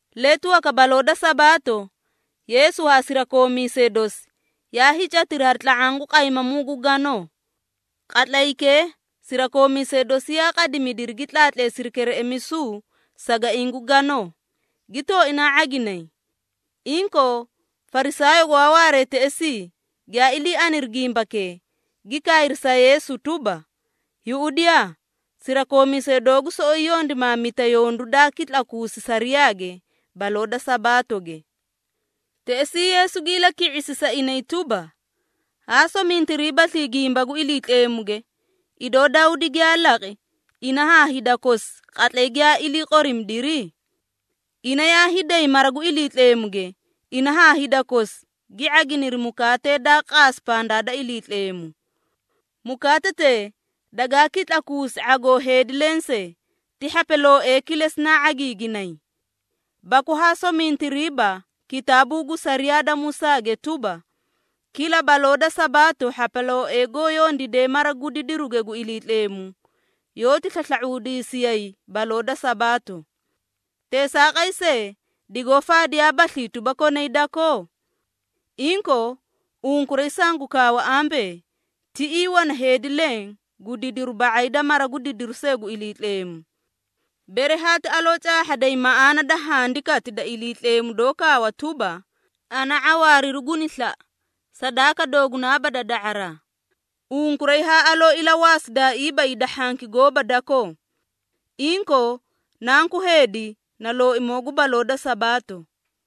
Letu waka baloo da Sabaato, Yeesu haa sirakoomiisee dosi yaa hiicatiri hari tla⁄aã gu qaymamuu gu ganoo. Qatlaykee sirakoomiisee dosi yaa qoriimidiri gi tlaatleesidi kereꞌemisu sagaiĩ gu ganoo, gi tooinaa ⁄aginay. Inkoo, Farisaayoo gwaa waaree teꞌesii giyaa ilii aniri gimbakee, gi kaayri sa Yeesu, tuba, “Yuꞌudiyaa, sirakoomiisee doogu soꞌoyi yondimaamita yondu daa kitlakuusi sariyaage baloo da Sabaatoge!” Teꞌesii Yeesu gi ilaki⁄isi sa inay tuba, “Haa somintiriibaslii gimba gu Iliitleemuge, idoo Dawdi giyaa laqi ina haa hida kosi qatlay giyaa ilii qoriimidiri? Ina yaa hiiday mara gu Iliitleemuge, ina haa hida kosi gi ⁄aginiri mukaate daa qaasi pandaa da Iliitleemu. Mukaatetee dagaa kitlakuusi ⁄agoo heedi lensee, ti hhapalooee kilesi naa ⁄agiiginay. Baku haa somintiriiba kitaabuu gu sariyaa da Musaage tuba, kila baloo da Sabaato hhapalooee goó yondiidee mara gu didiruge gu Iliitleemu, yoóti slasla⁄uudiisiyay baloo da Sabaato. Teesaaqay see, digoó faadiyaabaslii tuba, konay dakoo? Inkoo, unkuray sangu kaawa ambee, tiꞌii wana heedi leẽ gu didiru ba⁄ay da mara gu didiru see gu Iliitleemu. Bere haati aloo caahhaday maꞌaana da Handikati da Iliitleemu doó kaawa tuba, ‘Ana ⁄awaariru guni slaꞌa, sadaaka doogunaaba da da⁄araa,’ unkuray haa aloo ilawaasidaaiiba hida hhanki gooba dakoo. Inkoo, Nanku Heedi, na Looimoo gu baloo da Sabaato.”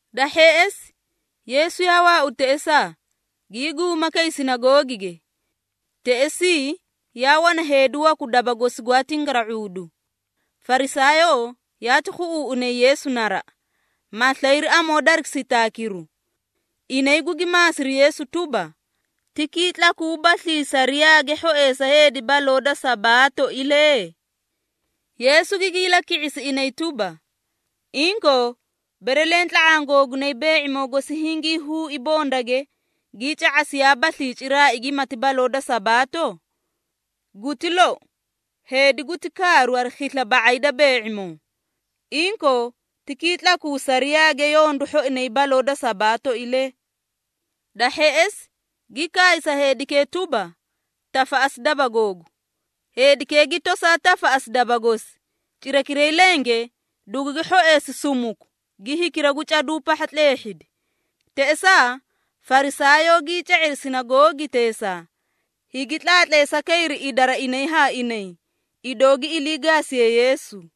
Da hheꞌesi, Yeesu yaa waaudi teꞌesaa, gii guuma kay sinagoogige. Teꞌesii yaa wana heedi waku daba gosi gwaa tingara⁄uudu. Farisaayoo yaati khuꞌuuꞌunay Yeesu naraꞌa, ma slayri amoo dari sitaakiru. Inay gugi maasiri Yeesu tuba, “Ti kitlakuubaslii sariyaage hhoeꞌesa heedi baloo da Sabaatoilee?” Yeesu gigi ilaki⁄isi inay tuba, “Inkoo, bere leẽ tla⁄aã googunay bee⁄imoo gosi hingii huui bondage, gii ca⁄asiyaabaslii ciraai gimati baloo da Sabaato? Guti lou, heedi guti kaaru hari khisla ba⁄ay da bee⁄imoo! Inkoo, ti kitlakuu sariyaage yondu hhoinay baloo da Sabaatoilee.” Da hheꞌesi, gi kaay sa heedikee tuba, “Tafaꞌasi daba googu!” Heedikee gi tosaa tafaꞌasi daba gosi, cirakiray lenge dugugi hhoeesi sumuku gi hikira gu caduu pahha tleehhidi. Teꞌesaa Farisaayoo gii ca⁄iri sinagoogiteesaa, higi tlaatleesa kayri idara inay haa inay, idoo gi ilii gaasiyee Yeesu.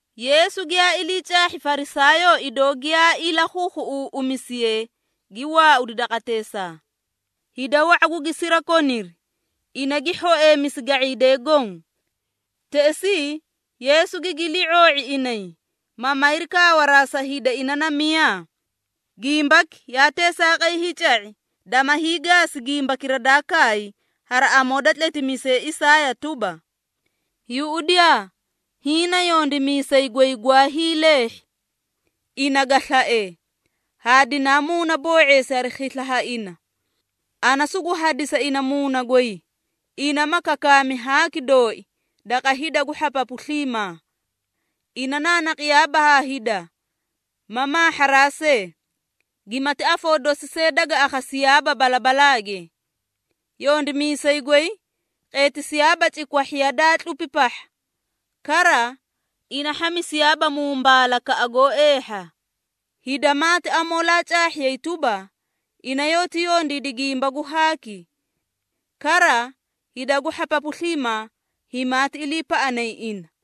Yeesu giyaa ilii caahhi Farisaayoo idoo giyaa ilakhuukhuꞌuuꞌumisiyee, gi waaudi daqateesaa. Hida wa⁄a gugi sirakoniri, ina gi hhoeemisi ga⁄iidee goõ. Teꞌesii Yeesu gigi ilii⁄oo⁄i inay, ma mayri kaawaraa sa hida ina na miyaa. Gimbaki yaa teesaaqay hiica⁄i, dama hiigaasi gimbakira daa kaay hari amoo da tletimiisay Isaaya tuba, “Yuꞌudiyaa! Hiĩ na yondimiisay goy gwaa hiileehhi. Ina ga slae, haa dinaa muunaboo⁄eesi hari khisla ha ina. Ana sugu hadisa ina Muuna goy, ina ma kakaami haaki dooi daqa hida gu hhapapu sliimaa. Ina naanaqiyaaba haa hida, ma maahharaa see, gimati afoo dosi see daga akhasiyaaba balabalaage. Yondimiisay goy qeetisiyaaba cikwahhiya daa tlupi pahha. Kara, ina hhamisiyaaba mumbaalakaꞌa goó eehha, hida maati amoolaa caahhiyay tuba, ina yoóti yondiidi gimba gu haaki. Kara, hida gu hhapapu sliimaa himaati iliipaꞌanay ina.”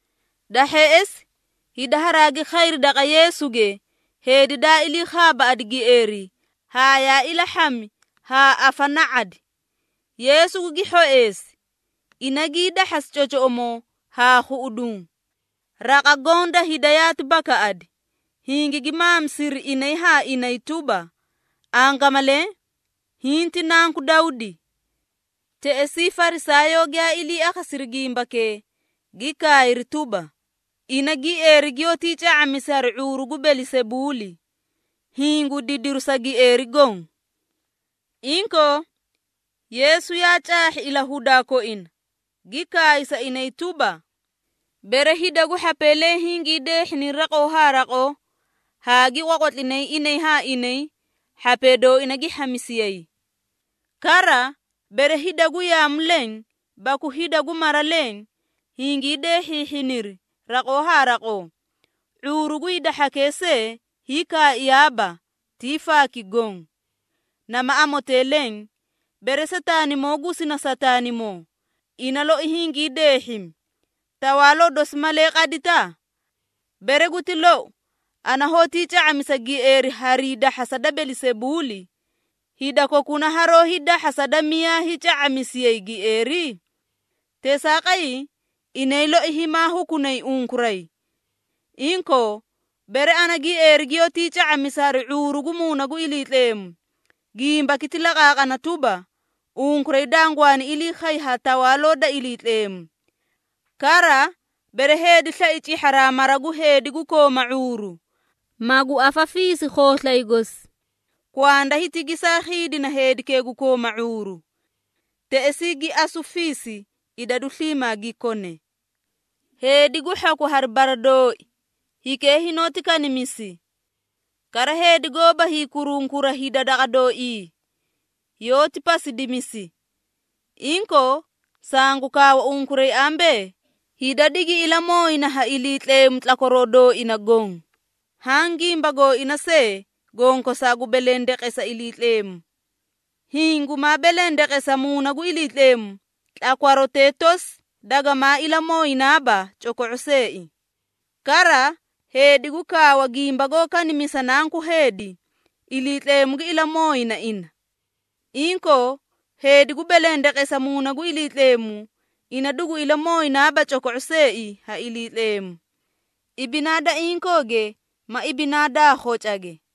Da hheꞌesi hida haraagi khayri daqa Yeesuge heedi daa ilii khaabaaꞌadi gieeri, haa yaa ilahhami haa afana⁄adi. Yeesu gugi hhoeesi, ina gii dahhasi cocoꞌomoo haa khuꞌuduũ. Raqa goõ da hida yaati bakaꞌadi, hingigi maamisiri inay haa inay tuba, “Angamalee, hiĩ ti na Nanku Dawdi.” Teꞌesii, Farisaayoo giyaa ilii akhasiri gimbakee, gi kaayri tuba, “Ina, gieeri giyoótii ca⁄amisi hari ⁄uuru gu Belisebuuli, hiĩ gu didiri sa gieeri goõ!” Inkoo, Yeesu yaa caahhi ilahudaa koina, gi kaay sa inay tuba, “Bere hida gu hhapee leẽ hingii deehhiniri raqoo haa raqoo, haa gi qwaqwatlinay inay haa inay, hhapee dooina gi hhamisiyay. Kara, bere hida gu yaamu leẽ baku hida gu mara leẽ hingii deehhiihhiniri raqoo haa raqoo, ⁄uuru gu hida hhakee see hiikaaiyaaba, tii faaki goõ. Nama amotee leẽ, bere Sataanimoo gusina Sataanimoo, ina loi hingii deehhimi, tawaaloo dosi malee qadita? Bere guti lou, ana hoótii ca⁄amisa gieeri harii dahhasa da Belisebuuli, hida kokuna haroó hiidahhasa da miyaa hiica⁄amisiyay gieeri? Teesaaqay, inay loi himaa hukunay unkuray. Inkoo, bere ana gieeri giyoótii ca⁄amisa hari ⁄uuru gu Muuna gu Iliitleemu, gimbaki ti laqaaqana tuba, unkuray dangwaani ilii khay ha Tawaaloo da Iliitleemu. Kara, bere heedi slai cihharaa mara gu heedi gu kooma ⁄uuru, magu afafiisi khooslay gosi, kwanda hiti gesaa khiidina heedikee gu kooma ⁄uuru. Teꞌesii gi asu fiisi idadu sliimaa gi kone. Heedi gu hhaku hari bara dooi, hikee hinoóti kanimisi. Kara heedi goóba hiikurunkura hida daqa dooii, yoóti pasidimisi. Inkoo, sangu kaawa unkuray ambee, hida digi ilamooyina ha Iliitleemu tlakwaroo dooina goõ, haã gimba gooina see gonkosaa gu belendeqesa Iliitleemu. Hiĩ gumaa belendeqesa Muuna gu Iliitleemu, tlakwarotee tosi dagamaa ilamooyinaaba coko⁄o seei. Kara, heedi gu kaawa gimba goó kanimisa Nanku Heedi, Iliitleemu gi ilamooyina ina. Inkoo, heedi gu belendeqesa Muuna gu Iliitleemu, ina dugu ilamooyinaaba coko⁄o seei ha Iliitleemu, ibinaa da inkooge ma ibinaa daa khocage.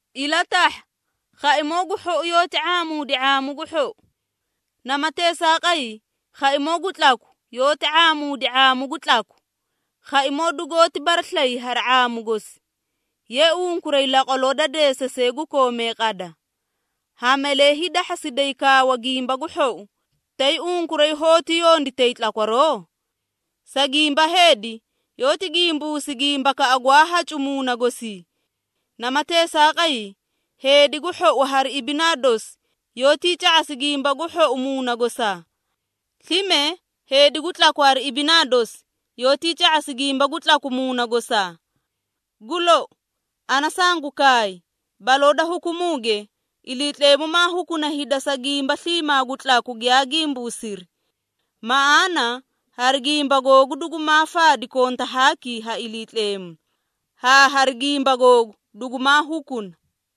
Ilatahha, khaimoo gu hhou yoóti ⁄aamuudi ⁄aamu gu hhou. Nama teesaaqay, khaimoo gu tlaku, yoóti ⁄aamuudi ⁄aamu gu tlaku. Khaimoo dugoóti baraslayi hari ⁄aamu gosi. Ye, unkuray laqwaloo da deesasee gu koomee qada! Ha malee hiidahhasiday kawaa gimba gu hhou, tay unkuray hoóti yonditay tlakwaroo? Sa gimba heedi, yoóti gimbuusi gimbakaꞌa gwaa hacu muuna gosii. Nama teesaaqay, heedi gu hhou hari ibinaa dosi yoótii ca⁄asi gimba gu hhou muuna gosaa. Slime heedi gu tlaku hari ibinaa dosi yoótii ca⁄asi gimba gu tlaku muuna gosaa. Gu lou, ana sangu kaay, baloo da hukumuuge, Iliitleemu maa hukuna hida sa gimba sliimaa gu tlaku giyaa gimbuusiri. Maꞌaana hari gimba googu dugumaa faadi konta haaki ha Iliitleemu, haa hari gimba googu dugumaa hukuna.”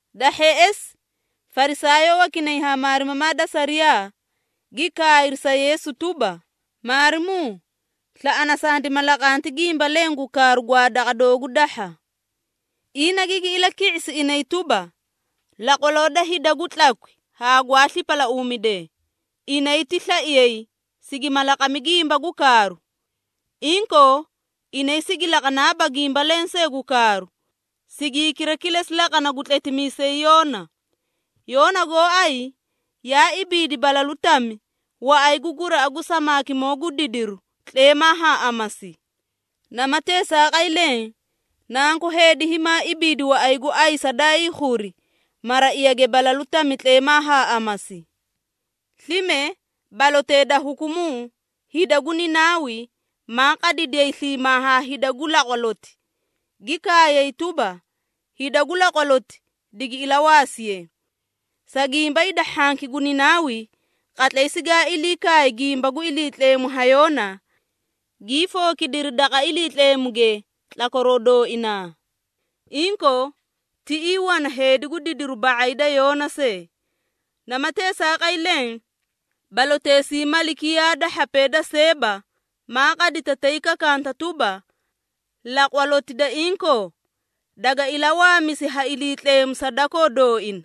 Da hheꞌesi, Farisaayoo wakinay haa maarimamaa da sariyaa, gi kaayri sa Yeesu tuba, “Maarimuu slaꞌana sandima laqanti gimba leẽ gu kaaru gwaa daqa doogu dahha.” Ina gigi ilaki⁄isi inay tuba, “Laqwaloo da hida gu tlakwi haa gwaa slipalauumidee, inay ti slaiyay, sigima laqami gimba gu kaaru. Inkoo, inay sigi laqanaaba gimba lensee gu kaaru, sigi hikira kilesi laqana gu tletimiisay Yoona. Yoona goóay yaa ibiidi balalu tami waꞌay gu guraꞌa gu samaakimoo gu didiru tleemaa haa amasi. Nama teesaaqay leẽ, Nanku Heedi himaa ibiidi waꞌay gu ayisa daa hiikhuri maraiyage balalu tami tleemaa haa amasi. Slime balotee da hukumuu hida gu Ninaawi, maa qadidiyay sliimaa haa hida gu laqwaloti, gi kaayay tuba, hida gu laqwaloti digi ilawaasiye. Sa gimba hida hhanki gu Ninaawi, qatlay sigaa ilii kaay gimba gu Iliitleemu ha Yoona, gii fookidiri daqa Iliitleemuge tlakwaroo dooinaa! Inkoo, tiꞌii wana heedi gu didiru ba⁄ay da Yoona see! Nama teesaaqay leẽ, baloteesii malikiyaa da hhapee da Seeba, maa qadita tay kakanta tuba, laqwaloti da inkoo, daga ilawaamisi ha Iliitleemu sa dakoo dooina.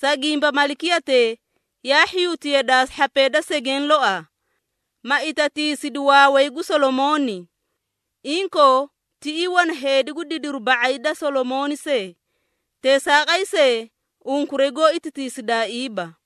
Sa gimba malikiyatee, yaa hhiyuti yadaa hhapee da segeẽ loaa, ma itatiisidi waaway gu Solomooni. Inkoo, tiꞌii wana heedi gu didiru ba⁄ay da Solomooni see, teesaaqay see unkuray goó itatiisidaaiiba!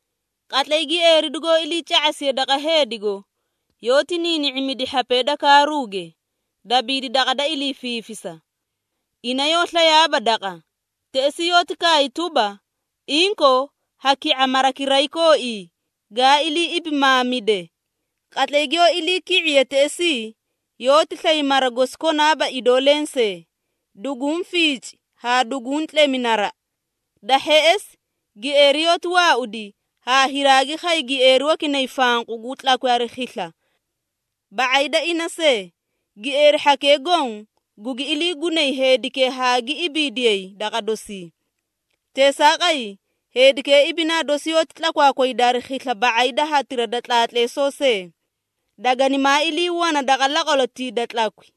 Qatlay gieeri dugoó ilii ca⁄asiye daqa heedigo, yoóti niini⁄imidi hhapee da kaaruuge, dabiidi daqa da ilii fiifisa. Ina yoó slayaaba daqa, teꞌesii yoóti kaay tuba, ‘Inkoo, ha ki⁄a marakiray kooii, gaa ilii ibimaamide.’ Qatlay giyoó iliiki⁄iye teꞌesii, yoóti slay mara gosi konaaba idoo lensee, duguũ fiici haa duguũ tlemi naraꞌa. Da hheꞌesi, gieeri yoóti waaudi haa hiraagi khay gieeri wakinay fanqu gu tlakwi hari khisla ba⁄ay da ina see. Gieeri hhakee goõ gugi iliigunay heedikee haa gi ibiidiyay daqa dosii. Teesaaqay, heedikee ibinaa dosi yoóti tlakwaakwayda hari khisla ba⁄ay da hatira da tlaatleesoo see. Daganimaa ilii wana daqa laqwalotii da tlakwi.”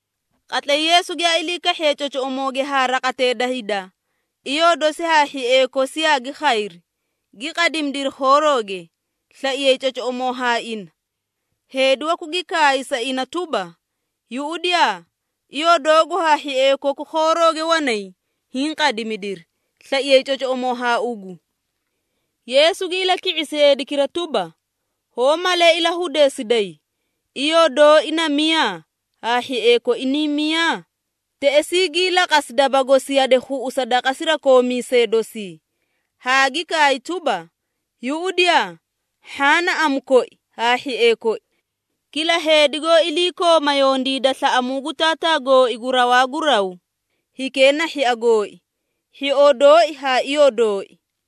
Qatlay Yeesu giyaa ilii kahhiye cocoꞌomooge haa raqatee da hida, iyoo dosi haa hhiee kosi yaagi khayri, gi qadimidiri khoorooge, slaiyay cocoꞌomoo haa ina. Heedi waku gi kaay sa ina tuba, “Yuꞌudiyaa, iyoo doogu haa hhiee koku khoorooge wanay hiĩ qadimidiri, slaiyay cocoꞌomoo haa ugu.” Yeesu gi ilaki⁄isi heedikira tuba, “Hoó malee ilahudeesiday, iyoo dooi na miyaa, haa hhiee koi niĩ miyaa?” Teꞌesii, gii laqasi daba gosi yade khuꞌusa daqa sirakoomiisee dosii, haa gi kaay tuba, “Yuꞌudiyaa, hhaã na amu koi haa hhiee koi! Kila heedi goó iliikooma yondiida slaꞌamuu gu Taataa gooi gu rawaa gu raw, hikee na hhia gooi, hhioo dooi haa iyoo dooi.”